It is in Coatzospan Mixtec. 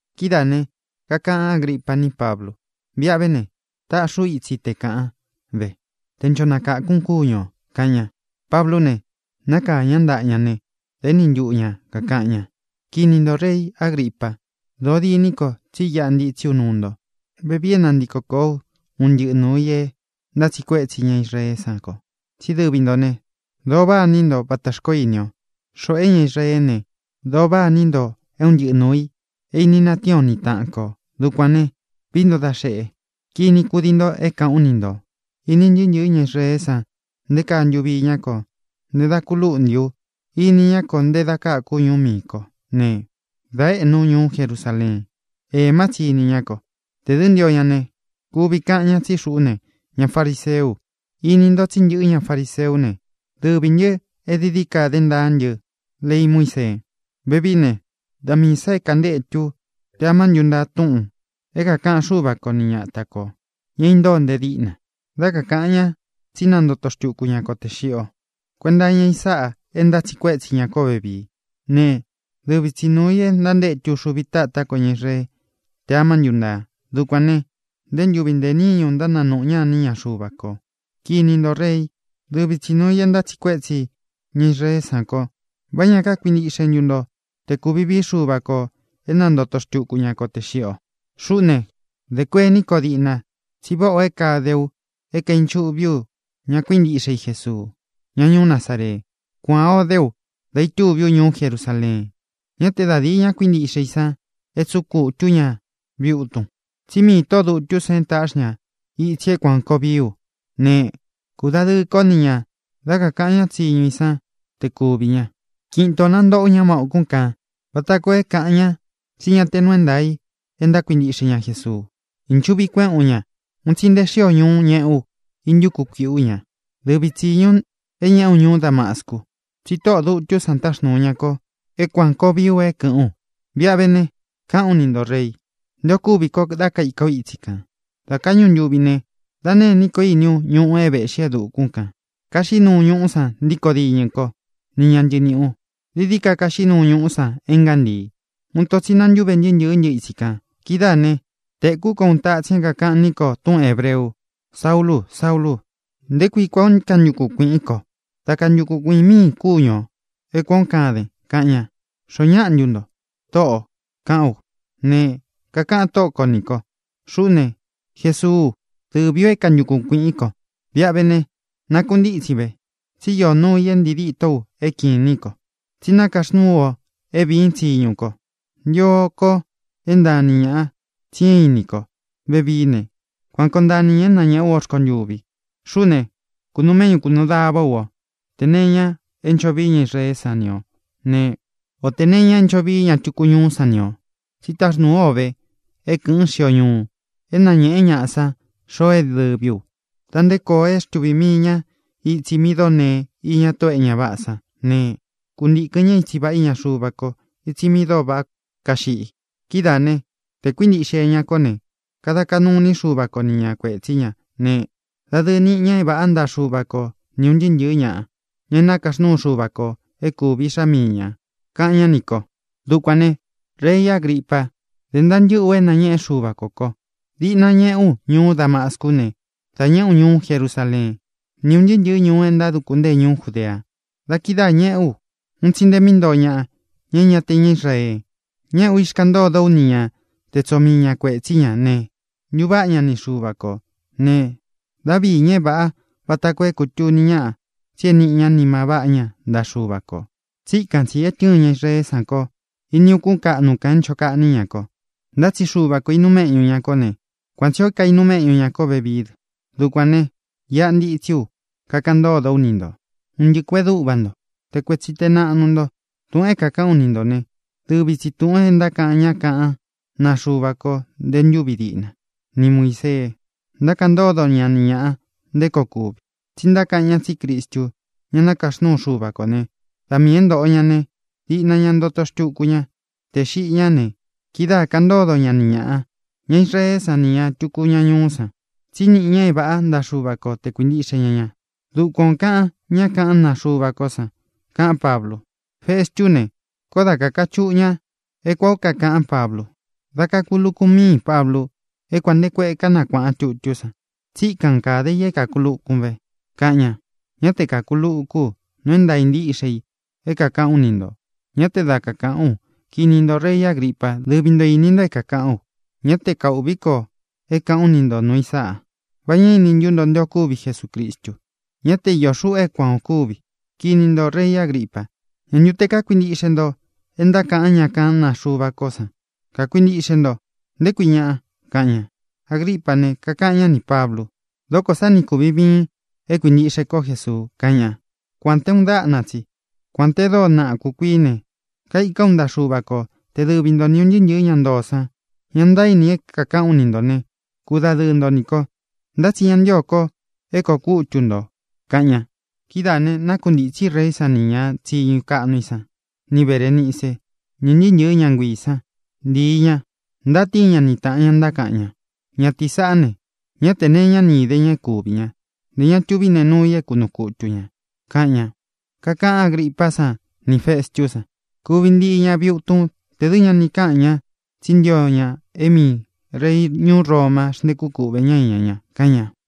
Kidáā ne, kakaꞌan Ágripa ní Pablu: —Viꞌa ve ne, taꞌxi ú itsi te kāꞌan ve, te ncho nakākun kúñu ō —kaꞌan ña. Pablú ne, nakāa ñá ntaꞌa ña ne, da éni ntuꞌu ña kākaꞌan ña: —Kini ntō, rei Agripa, dóo diní ko tsí iꞌa ntitsí u nuu nto vevii é nantiko kōó u un ntɨꞌɨ nuū i é ntátsiꞌi kuétsi ña Israeé san ko. Tsí dɨvi ntō né, dōo váꞌa ini nto vata xkoó ini o, xoꞌo é ña Israeé ne, dōo váꞌa ini nto é un ntɨꞌɨ nuū i é ini natíin o ni taꞌan kō. Dukuān ne, vií nto da xeꞌe, kini kúdii nto é kāꞌán u ni ntō. ʼIni ntɨɨ́ ntɨ̄ɨ́ ña Israeé san nté kaa ntuvi iñá ko nte da ku lúꞌnti u. Ini ñá ko nte da káku ú ñuú miī kó ne, dā éꞌnu ú ñuú Jerusaleen. Ēmá tsi ini ñá ko. Tē dɨ́ ntio ña ne, kuvi kaꞌan ña tsí xuꞌú ne, ña fariseú u. Ini nto tsí ntɨꞌɨ́ ña fariseú ne, dɨvī ntɨ é dií dií ka dé ntaa ntɨ́ lei Muísee. Vevií ne, da miī sá é kantétu u tē amá ntuntaa túꞌūn é kākaꞌan Xúva ko ni ñata kō, ña é intóo nte díꞌna, dá kakāꞌan ñá tsí nantoto xtuku ñá ko tē xiꞌi o. Kuenta iña i sáꞌā é ntátsiꞌi kuétsi ña kó vevii. Ne, dɨvi tsi nuū í e ntantétu uxuvi tátá ko ña Israeé tē amá ntuntaa. Dukuān né, ntē ntúvi, ntē níñu ntánanūꞌu ñá iní ña Xuva kō. Kini ntō, reí, dɨvi tsi nuū i é ntátsiꞌi kuétsi ña Israeé san ko. ¿Vá ña kákuintiꞌxe ntu nto te kūvi vií Xuva kō é nantoto xtuku ña ko tē xiꞌi o? ʼXuꞌú ne, dē kuení ko diꞌna tsí váꞌā o é kade ú é kaīnchuꞌví u ña kuíntiꞌxe i Jesuu, ñá ñuú Nazaree. Kuan ō dé u dá itúvi u ñuú Jerusaleen. Ñá te da dīi ña kuíntiꞌxe i san é tsuꞌun kutū ú ña viꞌi utun. Tsí miī tóꞌō dutú san táꞌxi ña itsi é kuān koo vií u ne, kūdadɨɨ kó ni ñā dá kakāꞌan ñá tsiñu i san te kuvī ña. Kiꞌin itō nantoꞌó u ña má ūkún kān vata koo é kāꞌan ña tsí ña te nuu é ntaā i e ntákuintiꞌxe ña Jesuu. Īnchuꞌvi kuéꞌēn ú ña. Un tsi nté xio ñuú ñeꞌé u íntuku kuīꞌí u ña. ʼDɨvi tsi tsīñu é ñeꞌé u ñuú Damascu. Tsi tóꞌō dutú san táxnūu ña ko é kuān koo vií u é kɨ̄ꞌɨ́n u. Viꞌa ve ne, káꞌān ú ni ntō, rei, nté ō kúvi ko dá kaika ú itsi kān. Dā káꞌñu ntuvi ne, da nêní ko íni ú ñuꞌu é vēꞌxí e dukún kān. Kaxiꞌí nuu ñuꞌú san ntíkō diñɨ kó ni ña ntɨɨ niꞌī u. Dií dií ka kaxiꞌí nuu ñuꞌú san é ngántii. Uun ito tsi nantúve ntɨɨ́ ntɨ̄ɨ́ ntɨ itsi kān. Kidáā ne, tēkú ko uun tatsin é kākaꞌan ní ko túꞌun hēbreu: “Saúlū, Saúlū, ¿nté kui kuān ó kantukun kuīꞌín ko? Dá kantukun kuīꞌin míīn kúñu ō é kuān ó kaden”, kaꞌan ña. “¿Xoó ñaꞌa ntu nto, Tóꞌō?”, kaꞌán u. Ne, kakaꞌan Tóꞌo ko nī kó: “Xuꞌú ne, Jesuú u. Dɨvī ú é kantukun kuīꞌín ko. Viꞌa ve ne, nakuntítsin ve, tsi íō nuu i é ntii ditó u é kīnín ko: tsí nakaxnúū ú o é vīín tsiñu ko. Ntio ko é ntaan ni ñāꞌa tsi é īnín ko vevií ne, kuan koo ntaan ni ñā é nañēꞌé u o rkontuvi. Xuꞌú ne, kūnuu méꞌñu, kūnuu davá u o tē nee iña é ncho vii ña Israeé san ni ō né, o tē nee iña é ncho vii ña tuku ñuú san ni ō. Tsi táxnūú u o ve é kɨ̄ꞌɨn xío ñuu, é nañēꞌen ñáꞌa san xoo é dɨvī u, da nte koo é xtuvī mii ña itsi mi dóo nee iña tóꞌō é ña váꞌā sán ne, kuntīkɨn ñá itsi vāꞌá iña Xuva ko, itsi mi dóo váꞌa kaxiꞌi. Kidáā né, tē kuíntiꞌxe ña kó ne, kada kaꞌnu iní Xuva ko ni ña kuētsí ña ne, dadɨɨ niꞌi ña é vāꞌá ntaꞌa Xuva ko ni ūn ntɨɨ́ ntɨ̄ɨ́ ñaꞌa, ña é nakaxnúu Xuva kō é kūvi iꞌxá mii ñā”, kaꞌan ñá nī ko. ʼDukuān ne, rei Agripa, dé ntaa ntɨ́ꞌɨ ú é nāñeꞌe Xúva kō ko. Diꞌna ñeꞌé u ñuú Damascu ne, dā ñeꞌé u ñuú Jerusaleen, ni ún ntɨɨ́ ntɨ̄ɨ́ ñuu é ntáduku ntée ñuú Judea. Da kidáā ñeꞌé u un tsi nte mi ntóo ñaꞌa, ña é ña te ña Israee. Ñéꞌē ú, ixkaꞌan ntódo ú ni ña te tsoo mii ña kuētsí ña ne, ntuváꞌa ña ni Xuva kō ne, dá viī ñá é vāꞌá vata koo é kūtuni ñáꞌa tsi é nīꞌi ña nima váꞌa ña ntaꞌa Xuva kō. Tsíkan tsī é tɨ́ɨn ña Israeé san ko ini ukún kaꞌnu kān é ncho kaꞌní ña ko. Ntá tsi Xuva kō inuu méꞌñu ña kó ne, kuan tsī ó kainuu méꞌñu ña kó vevií dɨ. Dukuān ne, iꞌa ntitsí u, kakaꞌan ntódo ú ni nto, un ntɨꞌɨ kuēꞌen dúꞌva nto, te kuetsi te naꞌnu nto. Túꞌūn é kākaꞌán u ni ntō né, dɨvi tsī túꞌūn e ntákaꞌan ñá kaꞌán naa Xuva ko nte ntúvi diꞌna, ni Muīsee, ntákaꞌan ntódo ña ni ñāꞌa nté koo kuvi. Tsí ntákaꞌan ñá tsí Cristu, ña nakaxnúu Xuva kō né, da miī é ntōꞌo ña ne, diꞌna ña ntoto xtuku ña tē xiꞌi ñá ne, kidáā kaꞌan ntódo ña ni ñāꞌa, ña Israeé san nī ña tuku ñuú san, tsí niꞌi ña é vāꞌá ntaꞌa Xuva ko tē kuíntiꞌxe ña ña. Dukuan ō kaꞌan ñá kaꞌán naa Xuva kó san —kaꞌán Pablu. Festú ne, koó da kakachuꞌu ña é kuān ó kakaꞌán Pablu. —¡Dá kakūlukun míin, Pablu! E kuān nté kueꞌe kánakuāꞌan tutú san, tsíkan kāde i é kākulukun ve —kaꞌan ña. —Ñá te kākulukú u. Nuu é ntāa ntíꞌxe i é kākaꞌán u ni ntō. Ñá te da kakaꞌán u. Kini ntō, rei Agripa, dɨ́vi nto īni nto é kākaꞌán u. Ñá te kaūꞌví ko é kāꞌán u ni ntō nuu i sáꞌa. ¿Va ñá ini ntú nto nté ō kúvi Jesucristu? Ñá te iō xuꞌu é kuan ō kúvi. Kini ntō, rei Agripa, ¿ñā ntu te kákuintiꞌxe nto é ntákaꞌan ñá kaꞌán naa Xuva kó san? Kakuintiꞌxe nto, ¿nté kui ñaꞌa? —kaꞌan ña. Agripá ne, kakaꞌan ñá nī Pablu: —¡Dókō sá ni kūvin viin é kuīntiꞌxe kó Jesuu! —kaꞌan ña. —Kuān te uun dáꞌna tsi, kuān te dóo naꞌa kūkuií ne, kaikán u ntaꞌa Xuva ko te dɨvi nto ni ūn ntɨɨ́ ntɨ̄ɨ́ ña ntoo san, ña ntaíni é kākaꞌan ú ni ntō ne, kudadɨɨ nto nī ko. Ntá tsi ña ntío ko é kōo kútu ntō —kaꞌan ña. Kidáā ne, nákuntāñɨ́ reí san nī ña tsiñu kaꞌnu i san, ni Berēnice, ni ūn ntɨɨ́ ntɨ̄ɨ́ ña nguiī san, ntíi ña. Ntátíin ña ni tāꞌan ña, ntákaꞌan ña: —Ñatīí sāꞌá ne, ñá te nee iñá ni īde ña é kūvi ña; ntē ña tuví nee nuu i é kunuu kutu ñā —kaꞌan ña. Kakaꞌan Ágripá san nī Festú san: —Kuvi ntii ña viꞌi utun tē dɨ́ ña ni káꞌan ña tsí ntio ña é miī rei ñuú Roma xntékú kuꞌvē ñá iña ña —kaꞌan ña.